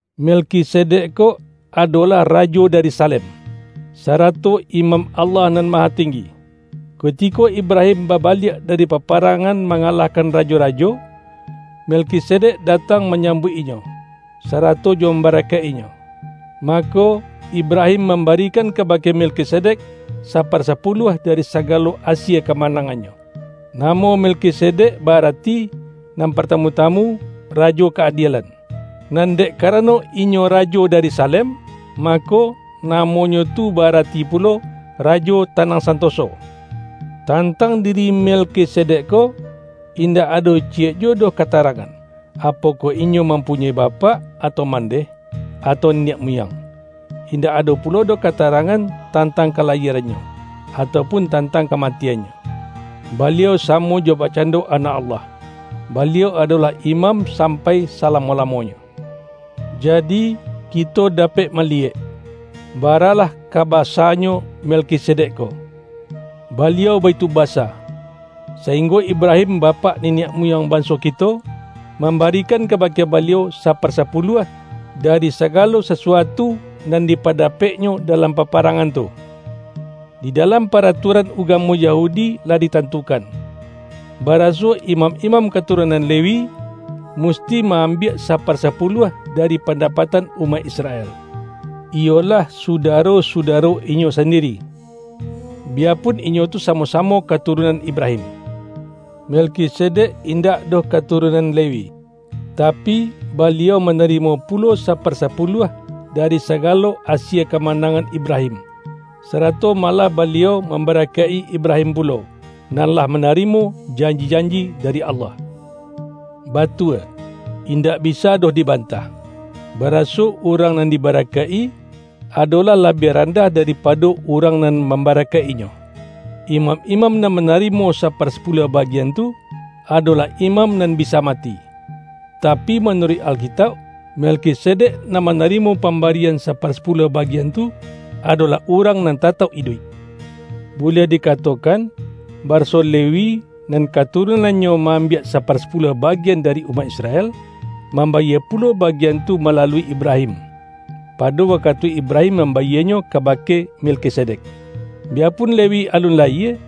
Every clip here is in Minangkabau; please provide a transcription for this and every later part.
Melkisedek ko adolah rajo da-ri Salem, sarato imam Allah Nan Mahatenggi. Kutiko Ibrahim babaliak dari paparangan mangalahkan rajo-rajo, Melkisedek datang manyambuik inyo, sarato jo mambarakaik-inyo. Mako, Ibrahim mambarikan kabake Melkisedek, saparsapuluah dari saga-lo asie kamanangannyo. (Namo Mel-kisedek ba-arati, nan partamu-tamu,”Rajo Ka-adielan"; nan dek karano inyo rajo dari Salem, mako, namonyo tu ba-arati pulo,”Rajo Tanang Santo-so".) Tantang diri Melkisedek ko, in-dak ado ciyek juwo doh katarangan, apokoh inyo mampunyoi bapak, atau mandeh, atau niniak muyang; indak ado pulo doh katarangan tantang ka-layierannyo, atau pun tantang kamati-annyo. Baliau samo jo bakcando Anak Allah; baliau adolah imam sampai sa-lamo-lamonyo. Jadi, kito dapek ma-liyek, baralah ka basa-nyo Melkisedek ko; baliau baitu basa, sainggo Ibra-him bapak niniak muyang banso kito, mambarikan kabake baliau saparsa-puluah, dari sagalo sasuatu nan dipa-dapeknyo dalam paparangan tu. Di dalam paratuaran ugamo Yahudi lah ditantukan, baraso imam-imam katu-runan Lewi, musti ma-ambiak sapar-sapuluah dari pandapatan umaik Isra-el, iyolah sudaro-sudaro inyo sandiri, biyapun inyo tu samo-samo katurun-an Ibrahim. Melkisedek indak doh katurunan Lewi, tapi, baliau mana-rimo pulo saparsapuluah dari sagalo asie kamanangan Ibrahim, sarato malah baliau mambarakaik-i Ibra-him pulo, nan lah manarimo janji-janji dari Allah. Batua, indak bisa doh dibantah, baraso urang nan di-barakaik-i, adolah labiah randah da-ripado urang nan mambarakaik-inyo. Imam-imam nan manarimo saparsa-puluah bagian tu, adolah imam nan bisa mati. Tapi manuruik Alkitauk, Melkisedek nan manarimo pambari-an saparsapuluah bagian tu, adolah urang nan tatauk iduik. Buliah di-katokan, baraso Lewi — nan katurun-annyo ma-ambiak saparsapuluah ba-gian dari umaik Israel — mambayie pulo bagian tu malalui Ibrahim, pado wakatu Ibrahim mambayienyo kaba-ke Melkisedek. Biyapun Lewi alun layie,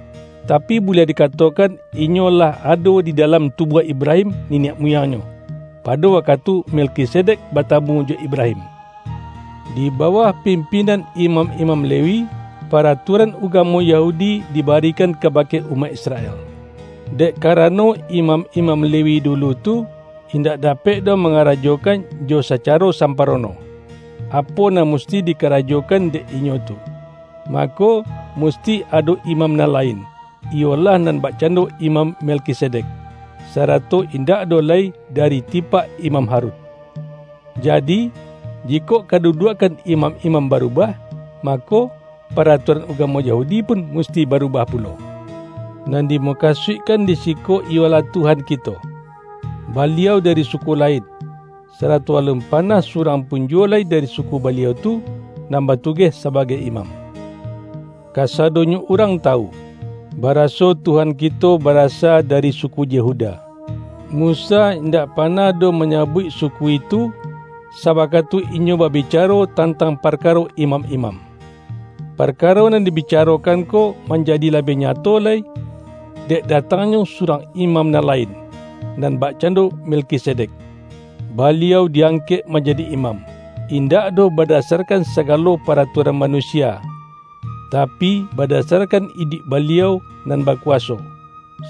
tapi, buliah dikatokan inyo lah ado di dalam tubuah Ibrahim niniak muyangnyo, pado wakatu Melkisedek batamu jo Ibrahim. Di bawah pimpinan imam-imam Lewi, paratuaran ugamo Yahudi diba-rikan kabake umaik Israel. Dek karano imam-imam Lewi dulu tu, indak dapek doh mangarajokan jo sacaro samparono, apo nan musti dikarajokan dek inyo tu, mako, musti ado imam nan lain, iyolah nan bakcando Imam Melkisedek, sara-to indak doh lai dari tipak Imam Harun! Jadi, jikok kaduduakkan imam-imam barubah, mako, paratuaran ugamo Ya-hudi pun musti barubah pulo. Nan di-mukasuikkan di siko iyolah Tuhan kito: Baliau dari suku lain, sarato alun panah surang pun juwo lai dari suku Baliau tu, nan batugeh sabagai imam. Kasado-nyo urang tawu, baraso Tuhan kito bara-sa dari suku Yehuda; Musa indak panah doh manyabuik suku itu, sawakatu inyo babicaro tantang parkaro imam-imam. Parkaro nan dibicarokan ko man-jadi labiah nyato lai, dek datangnyo surang imam nan lain, nan bakcan-do Melkisedek. Baliau di-angkek manjadi imam, indak doh badasar-kan sagalo paratuaran manusia, tapi, badasarkan iduik Baliau nan baku-waso,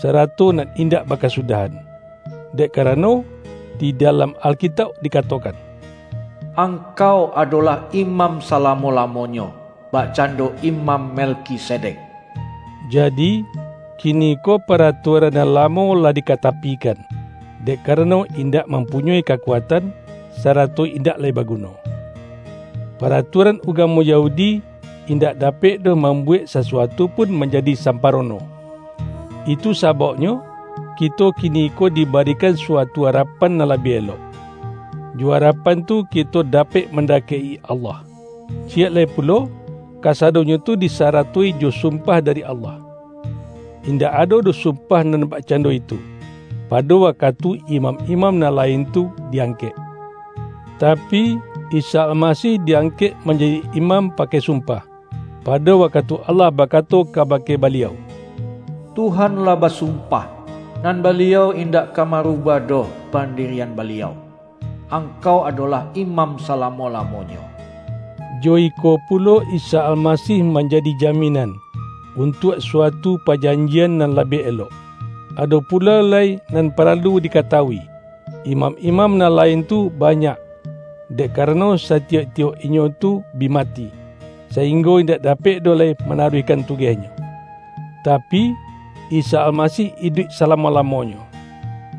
sarato nan indak bakasudah-an. Dek karano, di dalam Alkitauk dikatokan,”Angkau adolah imam sa-lamo-lamonyo, bakcando Imam Mel-kisedek.” Jadi, kiniko paratuaran nan lamo lah dikatapikan, dek ka-rano indak mampunyoi kakuatan, sarato indak lai baguno. Para-tuaran ugamo Yahudi, indak dapek doh mambuwek sasuatu pun man-jadi samparono. Itu sabauknyo, kito kiniko dibarikan suatu arapan nan labiah elok; jo arapan tu kito dapek mandakek-i Allah. Ciyek lai pulo, kasadonyo tu di-saratoi jo sumpah dari Allah. Indak ado doh sumpah nan bakcando itu, pado wakatu imam-imam nan lain tu di-angkek. Tapi, Isa Almasih di-angkek manjadi Imam pakai sumpah, pado wakatu Allah bakato kabake Ba-liau,”Tuhan lah basumpah, nan Baliau indak ka marubah doh pandirian Baliau, ’Angkau adolah Imam salamo-lamonyo.’” Jo iko pulo Isa Almasih manjadi jaminan, untuak suatu pajanjian nan labiah elok. Ado pulo lai nan paralu dikata-wui: imam-imam nan lain tu banyak, dek karano satiyok-tiyok inyo tu bi mati, sainggo indak dapek doh lai manaruihkan tugehnyo. Tapi, Isa Almasih iduik salamo-lamonyo,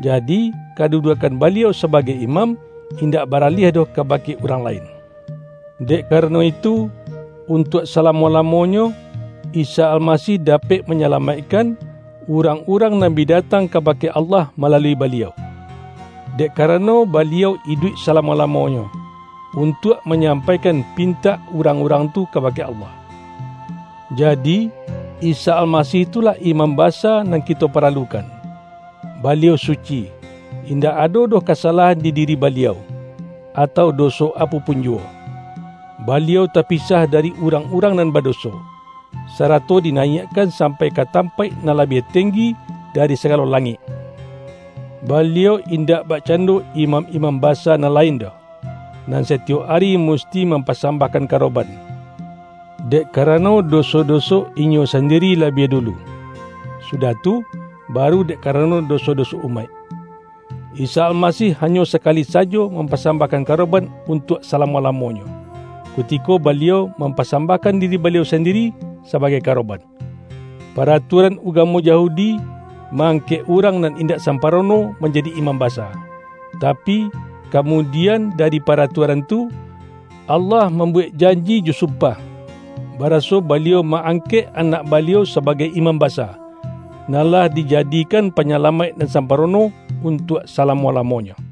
jadi kaduduakkan Baliau sabagai Imam, indak baraliah doh kabake urang la-in. Dek karano itu, untuak sala-mo-lamonyo, Isa Almasih dapek ma-nyalamaikkan, urang-urang nan bi datang kabake Allah malalui Baliau, dek karano Baliau iduik salamo-lamonyo, untuak manyampaikan pin-tak urang-urang tu kabake Allah. Jadi, Isa Almasih tu lah Imam Ba-sa nan kito paralukan. Baliau suci; in-dak ado doh kasalahan di diri Baliau, atau doso apo pun juwo. Baliau ta-pisah dari urang-urang nan badoso, sarato dinayiakkan sampai ka tam-paik nan labiah tenggi dari sagalo la-ngik. Baliau indak bakcando imam-imam basa nan lain doh, nan satiyok ari musti mampasambahkan karoban, dek karano doso-doso inyo sandiri la-biah dulu, sudah tu baru dek karano doso-doso umaik. Isa Almasih hanyo sakali sajo mampasambahkan karo-ban untuak salamo-lamonyo, kutiko Baliau mampasambahkan diri Baliau sandiri sabagai karoban. Paratua-ran ugamo Yahudi, ma-angkek urang nan indak samparono manjadi imam basa. Tapi, kamudian dari paratuaran tu, Allah mambuwek janji jo sumpah, baraso Baliau ma-angkek Anak Baliau sabagai Imam Basa, nan lah dijadikan Panyalamaik nan samparono untuak salamo-lamonyo.